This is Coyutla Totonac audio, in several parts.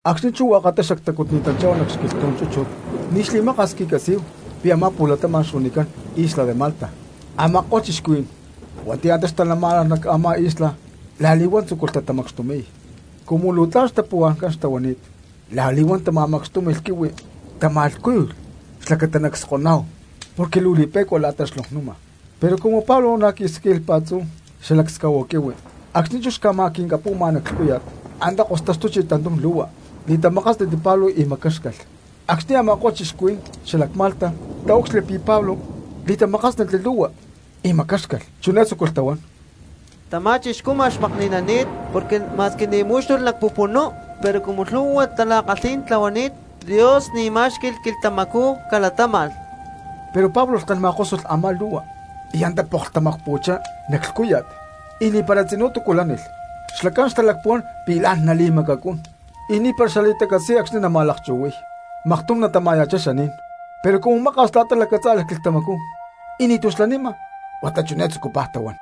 Acxni̠ chú hua̠katá xactacutni̠tanchá̠hu nac xquilhtú̠n chúchut ni̠ xli̠maka̠s cqui̠catzí̠hu pi̠ a̠má pu̠latama̠n xuanicán isla de Malta. Ama̠ko̠lh cristianos hua̠nti̠ antá xtalamá̠nalh nac a̠má isla la̠li̠huán tzúculh tatamacxtumi̠y; cumu luu tla̠n xtapa̠xuhuá̠n xtahuani̠t la̠li̠huán tama̠macxtúmi̠lh quihui, tama̠lhcúyulh xlacata nacskoná̠hu porque luu li̠pe̠cua la̠ta xlonknuma. Pero cumu Pablo na̠ quí̠sacli pa̠tzú xascahuahua quihui acxni̠ chú xca̠ma̠quincapu̠ma nac lhcúya̠t antá kostaxtuchi tantum lu̠hua, li̠tamakásnatli Pablo y macáxcalh. Acxni̠ a̠ma̠ko̠lh cristianos xalac Malta taúcxilhli pi̠ Pablo li̠tamakásnatli lu̠hua y macáxcalh, chiné tzúculh tahuán: —Tamá chixcú ma̠x makni̠nani̠t, porque ma̠squi ni̠ mú̠xtulh nac pupunú pero cumu lhu̠hua tala̠kalhí̠n tlahuani̠t Dios ni̠ ma̠xqui̠y quilhtamacú calatáma̠lh. Pero Pablo lhken ma̠kósulh a̠má lu̠hua y antá poklh tamacpu̠chá nac lhcúya̠t, y ni̠para tzinú túcu lánilh. Xlacán xtalacpuhuán pi̠ la̠n nali̠macacún y ni̠para xali̠tacatzí̠n acxni̠ nama̠lakchu̠hui̠y, maktum natama̠ya̠chá xaní̠n. Pero cumu maka̠s la̠ta lacatzá̠lalh quilhtamacú y nítú xlanima huata chiné tzucupaj tahuán: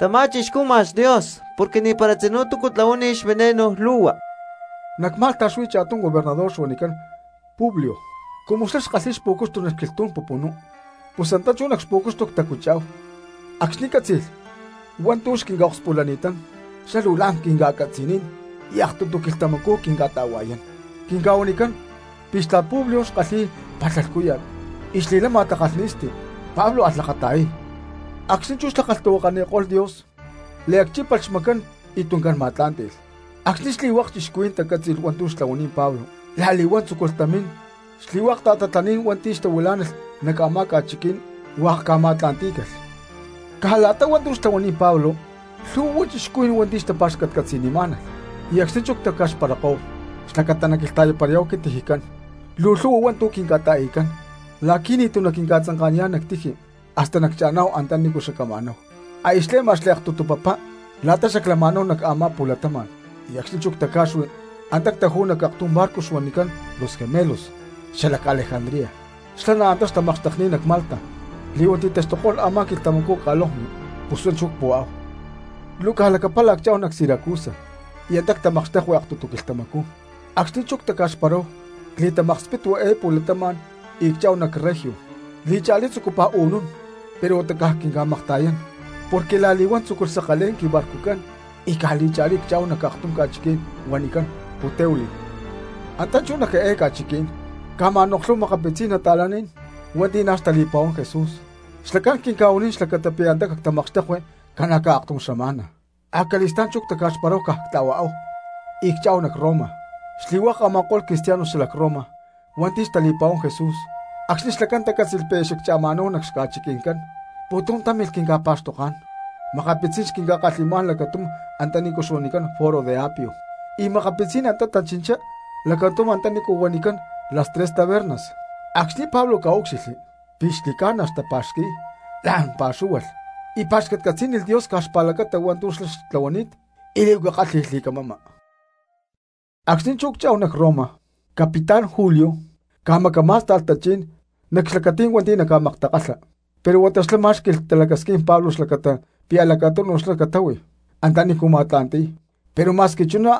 —¡Tamá chixcú ma̠x cha̠tum Dios porque ni̠para tzinú túcu tlahuánilh xveneno lu̠hua! Nac Malta xuí cha̠tum gobernador xuanicán Publio, cumu xlá xkalhíy xpu̠cuxtu nac xquilhtú̠n pupunú pus antá chú nac xpu̠cuxtu ctacutchá̠hu. Acxni̠ cátzi̠lh hua̠ntu̠ xquinca̠akspulani̠tán xlá luu tla̠n quinca̠catzi̠nín y aktutu quilhtamacú quinca̠ta̠hua̠yán. Quinca̠huanicán pi̠ xtla̠t Publio xkalhi̠y palha lhcúya̠t y xli̠lama takalhni̠sti. Pablo alh lakata̠yay, acxni̠ chú xlá kalhtahuakaniko̠lh Dios, liacchípalh xmacán y tuncán ma̠tlá̠nti̠lh. Acxni̠ xli̠hua̠k cristianos tacátzi̠lh hua̠ntu̠ xtlahuani̠t Pablo la̠li̠huán tzúculh tamín xli̠hua̠k ta̠tatlaní̠n hua̠nti̠ xtahuilá̠nalh nac a̠má ca̠chiquí̠n y hua̠k ca̠ma̠tla̠ntí̠calh. Caj la̠ta hua̠ntu̠ xtlahuani̠t Pablo lhu̠hua cristianos hua̠nti̠ xtapa̠xcatcatzi̠nimá̠nalh, y acxni̠ chú aya ctaca̠xkó̠hu xlacata nacquilhta̠yaparayá̠hu quintijicán luu lhu̠hua hua̠ntu̠ quinca̠ta̠i̠cán la̠qui̠ ni̠tu̠ naquinca̠tzanka̠niyá̠n nac tiji hasta naccha̠ná̠hu antanícu xacama̠náhu. Aya xle̠ma xliaktutu papá la̠ta xaclama̠náhu nac a̠má pu̠latama̠n y acxni̠ chú ctaca̠xui antá ctajú̠hu nac aktum barco xuanicán Los Gemelos xalac Alejandría, xlá na̠ antá xtamakxtekni̠t nac Malta li̠huán ti̠taxtuko̠lh a̠má xquilhta ca̠lonkni, pus huá chú cpu̠háhu. Luu caj lacapala cchá̠hu nac Siracusa, y antá ctamakxtekui aktutu quilhtamacú. Acxni̠ chú antá ctaca̠xparáhu cli̠tamakspitui eé pu̠latama̠n y cchá̠hu nac Regio, li̠cha̠lí chú tzucupaj u̠nún pero huata caj quinca̠makta̠yán porque la̠li̠huán tzúculh sakalé̠n quibarcucán y caj li̠cha̠lí cchá̠hu nac aktum ca̠chiquí̠n huanicán Puteoli. Antá chú nac eé ca̠chiquí̠n ca̠ma̠noklhúhu makapitzí̠n nata̠lán hua̠nti̠ na̠ xtali̠pa̠huán Jesús xlacán quinca̠huanín xlacata pi̠ antá cactamakxtekui ca̠na̠caj aktum xama̠na; acali̠stá̠n chú ctaca̠xparáhu, caj ctla̠huaáhu y cchá̠hu nac Roma. Xli̠hua̠k a̠ma̠ko̠lh cristianos xalac Roma hua̠nti̠ xtali̠pa̠huán Jesús, acxni̠ xlacán tacátzi̠lh pi̠ aya xaccha̠ma̠náhu nac xca̠chiqui̠ncán, pu̠tum támilh quinca̠pa̠xtoká̠n; makapitzí̠n xquinca̠kalhi̠má̠n lacatum antanícu huanicán Foro de Apio, y makapitzí̠n antá tachinchá lacatum antanícu huanicán Las Tres Tabernas. Acxni̠ Pablo ca̠úcxilhli pi̠ xli̠ca̠na xtapa̠xqui̠y la̠n pa̠xúhualh y pa̠xcatcatzí̠nilh Dios caj xpa̠lacata hua̠ntu̠ xlá xtlahuani̠t y li̠huaca kálhi̠lh li̠camama. Acxni̠ chú cchá̠hu nac Roma capitán Julio ca̠macamá̠sta̠lh tachí̠n nac xlacatí̠n hua̠nti̠ naca̠maktakalha, pero huata xlá má̠xqui̠lh talacasquín Pablo xlacata pi̠ lacatunu xlá catáhui antanícu ma̠tla̠nti̠y, pero ma̠squi chuná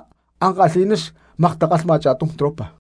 ankalhi̠ná xmaktakalhma cha̠tum tropa.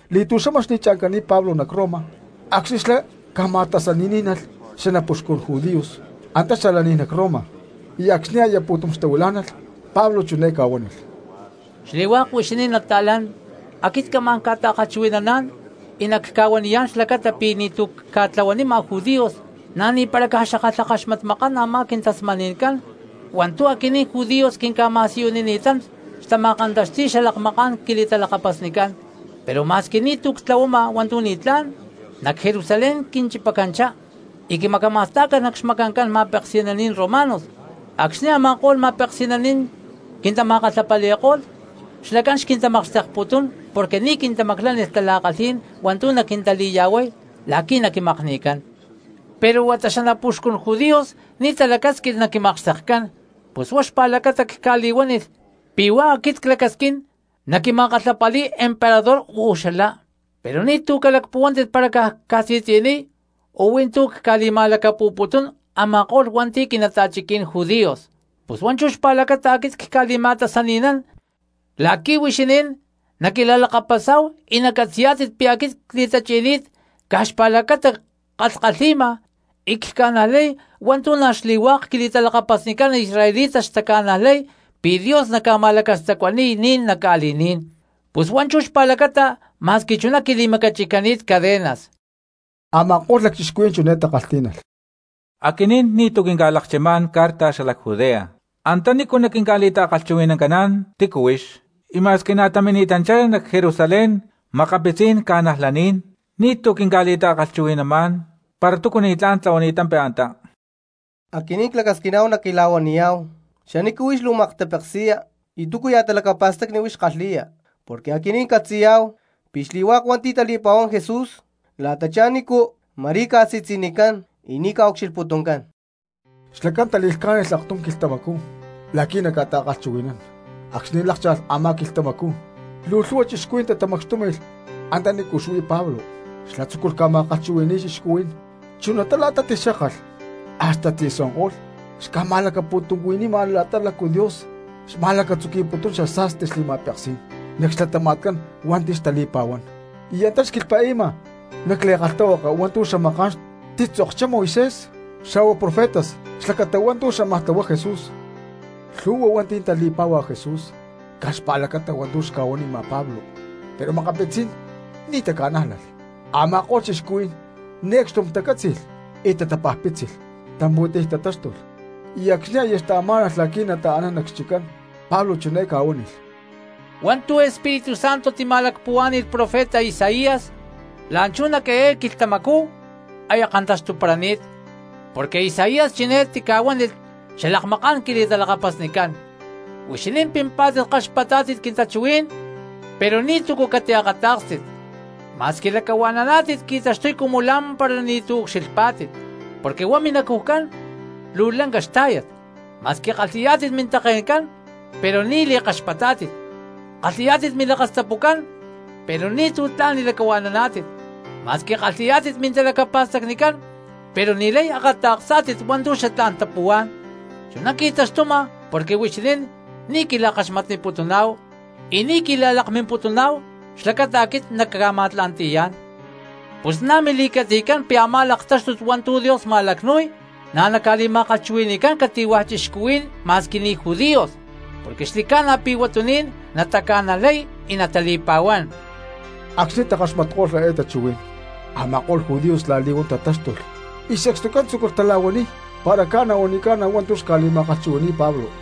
Li̠tu̠xama xli̠cha̠ncani̠t Pablo nac Roma acxni̠ xlá ca̠ma̠tasaní̠nalh xanapuxcun judíos antá xalaní̠n nac Roma, y acxni̠ aya pu̠tum xtahuilá̠nalh Pablo chiné ca̠huánilh: —Xli̠hua̠k huixinín nata̠lán, aquit camá̠n ca̠ta̠kalhchuhui̠naná̠n y nacca̠huaniyá̠n xlacata pi̠ ni̠tu̠ cca̠tlahuanima judíos na̠ ni̠para caj xackalhakaxmatmakán a̠má quintasmani̠ncán hua̠ntu̠ aquinín judíos quinca̠ma̠siyunini̠tán xtama̠kantaxti̠y xalakmaká̠n quili̠talakapasnicán. Pero ma̠squi ni̠tu̠ ctlahuama hua̠ntu̠ ni̠tlá̠n, nac Jerusalén quinchipacanchá y quimacama̠stá̠calh nac xmacancán ma̠peksi̠naní̠n romanos. Acxni̠ a̠ma̠ko̠lh ma̠peksi̠naní̠n quintama̠kalhapali̠ko̠lh xlacán xquintamakxtekputún porque ni̠ quintamaclánilh tala̠kalhí̠n hua̠ntu̠ naquintali̠ya̠huay la̠qui̠ naquimakni̠cán. Pero huata xanapuxcun judíos ni̠ talacásquilh naquimakxtekcán, pus huá xpa̠lacata cca̠li̠huánilh pi̠ huá aquit clacasquín naquima̠kalhapali̠y emperador uú xalá, pero ni̠tu̠ nalacpuhuaná̠tit para caj cca̠si̠tzi̠niy o huí tú cca̠li̠ma̠lacapu̠putún a̠ma̠ko̠lh hua̠nti̠ quinata̠chiquí̠n judíos. Pus huá chú xpa̠lacata aquit cca̠li̠ma̠tasani̠nán la̠qui̠ huixinín naquila̠lakapasá̠hu y nacatzi̠yá̠tit pi̠ aquit cli̠tachi̠ni̠t caj xpa̠lacata ckalhkalhi̠ma y cca̠najlay hua̠ntu̠ na̠ xli̠hua̠k quili̠talakapasnicán israelitas xtaca̠najlay pi̠ Dios naca̠ma̠lacastacuani̠y ni̠n nac ca̠li̠ní̠n, pus huá chú xpa̠lacata ma̠squi chuná quili̠macachi̠cani̠t cadenas. Ama̠ko̠lh lacchixcuhuí̠n chiné takalhtí̠nalh: —Aquinín ni̠tu̠ quinca̠lakchimá̠n carta xalac Judea antanícu naquinca̠li̠ta̠kalhchuhui̠nancaná̠n tícu huix, y ma̠squi na̠ tamini̠tanchá nac Jerusalén makapitzí̠n cristianos ni̠tu̠ quinca̠li̠ta̠kalhchuhui̠namá̠n para túcu ni̠tlá̠n tlahuani̠tampi antá. Aquinín clacasquina̠huá naquila̠huaniyá̠hu xanícu huix luu maktapeksi̠ya y túcuya̠ talacapa̠stacni huix kalhi̠ya, porque aquinín ccatzi̠yá̠hu pi̠ xli̠hua̠k hua̠nti̠ tali̠pa̠huán Jesús la̠tachá nícu ma̠rí ca̠si̠tzi̠nicán y ni̠ ca̠ucxilhputuncán. Xlacán tali̠lhcá̠nilh aktum quilhtamacú la̠qui̠ naca̠ta̠kalhchuhui̠nán, acxni̠ lákcha̠lh a̠má quilhtamacú luu lhu̠hua cristianos tatamacxtúmi̠lh antanícu xuí Pablo. Xlá tzúculh ca̠ma̠kalhchuhui̠ni̠y cristianos, chunatá la̠ta tixkákalh hasta tzi̠suanko̠lh xca̠ma̠lacapu̠tuncuhui̠nima la̠ta lácu Dios xma̠lacatzuqui̠putún xasa̠sti xli̠ma̠peksí̠n nac xlatama̠tcán hua̠nti̠ tali̠pa̠huán, y antá xquilhpa̠i̠ma nac li̠kalhtahuaka hua̠ntu̠ xamaká̠n titzokchá Moisés xa̠hua profetas xlacata hua̠ntu̠ xámaj tlahuay Jesús. Lhu̠hua hua̠nti̠ tali̠pá̠hualh Jesús caj xpa̠lacata hua̠ntu̠ xca̠huanima Pablo, pero makapitzí̠n ni̠ taca̠nájlalh. Ama̠ko̠lh cristianos ni̠ acxtum tacátzi̠lh y tatapajpítzilh, tampu̠tiy tatáxtulh, y acxni̠ aya xtataxtumá̠nalh la̠qui̠ nataaná nac xchiccán Pablo chiné ca̠huánilh: —Hua̠ntu̠ Espíritu Santo tima̠lacpuhuá̠ni̠lh profeta Isaías la̠nchú nac eé quilhtamacú aya kantaxtuparani̠t. Porque Isaías chiné tica̠huánilh xalakmaká̠n quili̠talakapasnicán: Huixinín pimpá̠tit kaxpatá̠tit quintachuhuí̠n, pero ni̠túcu catiakatá̠kstit; ma̠squi lacahua̠naná̠tit qui̠taxtuy cumu la̠mpara ni̠tu̠ ucxilhpá̠tit. Porque huá minacujcán luu lanca xtá̠yat, ma̠squi kalhi̠yá̠tit mintake̠ncán pero ni̠ li̠kaxpatá̠tit, kalhi̠yá̠tit milakastapucán pero ni̠tu̠ tla̠n li̠lacahua̠naná̠tit, ma̠squi kalhi̠yá̠tit mintalacapa̠stacnicán pero ni̠lay akata̠ksá̠tit hua̠ntu̠ xatlá̠n tapuhuá̠n, chuná qui̠taxtuma porque huixinín ni̠ quila̠kaxmatniputuná̠hu y ni̠ quila̠lakmimputuná̠hu xlacata aquit nacca̠ma̠tla̠nti̠yá̠n. Pus na̠ mili̠catzi̠tcán pi̠ a̠má laktáxtut hua̠ntu̠ Dios ma̠lacnu̠y na̠ naca̠li̠ma̠kalhchuhui̠ni̠cán cati̠hua̠ cristiano ma̠squi ni̠ judíos, porque xli̠ca̠na pi̠ huatuní̠n nataca̠najlaniy y natali̠pa̠huán. Acxni̠ takaxmatko̠lh eé tachuhuí̠n a̠ma̠ko̠lh judíos la̠li̠huán tatáxtulh y sacstucán tzúculh tala̠huaniy para ca̠na o ni̠ca̠na hua̠ntu̠ xca̠li̠ma̠kalhchuhui̠ní̠y Pablo.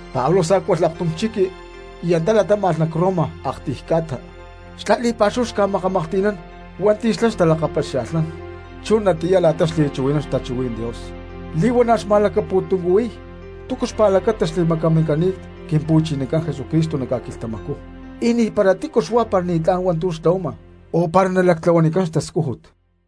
Pablo sá̠cualh aktum chiqui y antá latáma̠lh nac Roma aktiy ca̠ta, xlá li̠pa̠xúhu xca̠makamaklhti̠nán hua̠nti̠ xlá xtalakapaxia̠lhnán. Chunatiyá la̠ta xli̠chuhui̠nán xtachuhuí̠n Dios, li̠huana̠ xma̠lacapu̠tuncuhui̠y túcu xpa̠lacata xli̠macamincani̠t Quimpu̠chinacán Jesucristo nac ca̠quilhtamacú, y ni̠para tícu xuá para ni̠tlá̠n hua̠ntu̠ tlahuama o para nalactlahuanicán xtascújut.